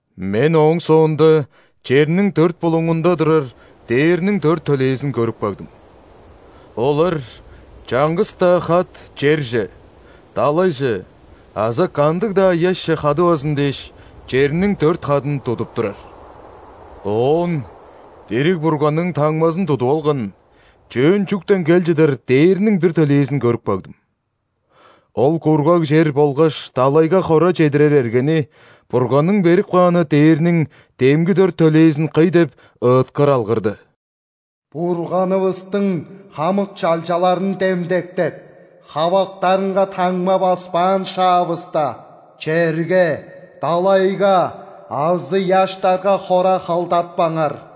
Мен ооң соонда черниң дөрт булуңунда турар дээрниң дөрт төлээзин көрүп кагдым: олар чаңгыс-даа хат черже, далайже азы кандыг-даа ыяшче хадывазын дээш, черниң дөрт хадын тудуп турар. Оон дириг Бурганның таңмазын тудуп алган, чөөн чүктен кел чыдар дээрниң бир төлээзин көрүп кагдым. Ол кургаг чер болгаш далайга хора чедирер эргени Бурганның берип кааны дээрниң демги дөрт төлээзин кый деп, ыыткыр алгырды: «Бурганывыстың хамык чалчаларын демдектеп, хавактарынга таңма баспаан шаавыста, черге, далайга азы ыяштарга хора халдатпаңар».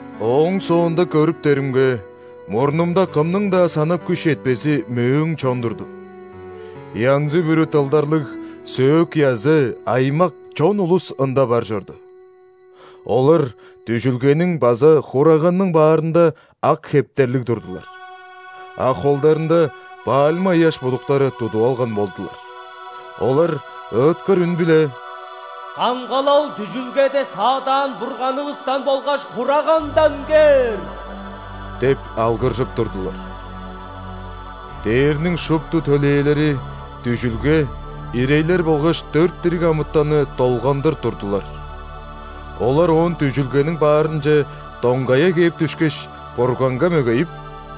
Ооң соонда көрүптеримге, мурнумда кымның-даа санап күш четпези мөөң чон турду. Янзы-бүрү дылдарлыг сөөк-язы, аймак, чон улус ында бар чорду. Олар дүжүлгениң база Хураганның баарында ак хептерлиг турдулар, а холдарында пальма ыяш будуктары тудуп алган болдулар. Олар ыыткыр үн-биле: «Камгалал дүжүлгеде саадаан Бурганывыстан болгаш Хурагандан кээр!» – деп алгыржып турдулар. Дээрниң шупту төлээлери дүжүлге, ирейлер болгаш дөрт дириг амытанны долгандыр турдулар. Олар оон дүжүлгениң баарынче доңгая кээп дүшкеш, Бурганга мөгейип: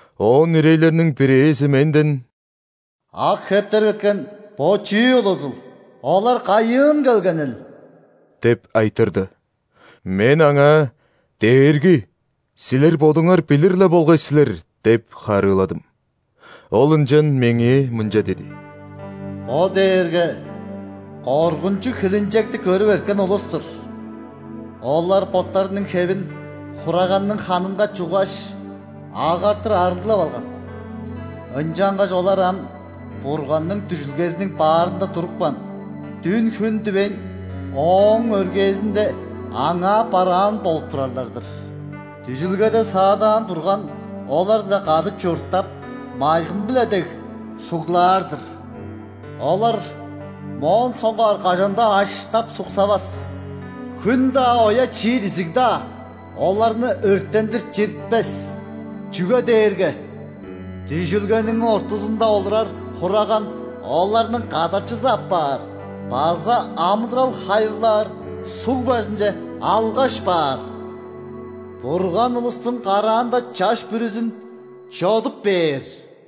Оон ирейлерниң бирээзи менден: «Ак хептер кеткен бо чүү улузул? Олар кайыын келгенил?» – деп айтырды. Мен аңаа: «Дээрги, силер бодуңар билир-ле болгай силер» – деп харыыладым. Ол ынчан меңээ мынча диди: «Бо дээрге коргунчуг хилинчекти көрүп эрткен улус-тур. Олар боттарының хевин Хураганның ханынга чуггаш, агартыр арыглап алган. Ынчангаш олар ам Бурганның дүжүлгезиниң баарында турупкан, дүн-хүн дивейн, Ооң өргээзинде Аңаа бараан болуп турарлар-дыр. Дүжүлгеде саадаан Бурган олар-биле кады чурттап, майгын-биле дег шуглаар-дыр. Олар моон соңгаар кажан-даа аштап-суксавас. Хүн-даа, оя чиир изиг-даа оларны өрттендир чиртпес. Чүге дээрге дүжүлгениң ортузунда олурар Хураган оларның кадарчызы апаар база амыдырал хайырлаар суг бажынче алгаш баар. Бурган улустуң караанда чаш бүрүзүн чодуп бээр».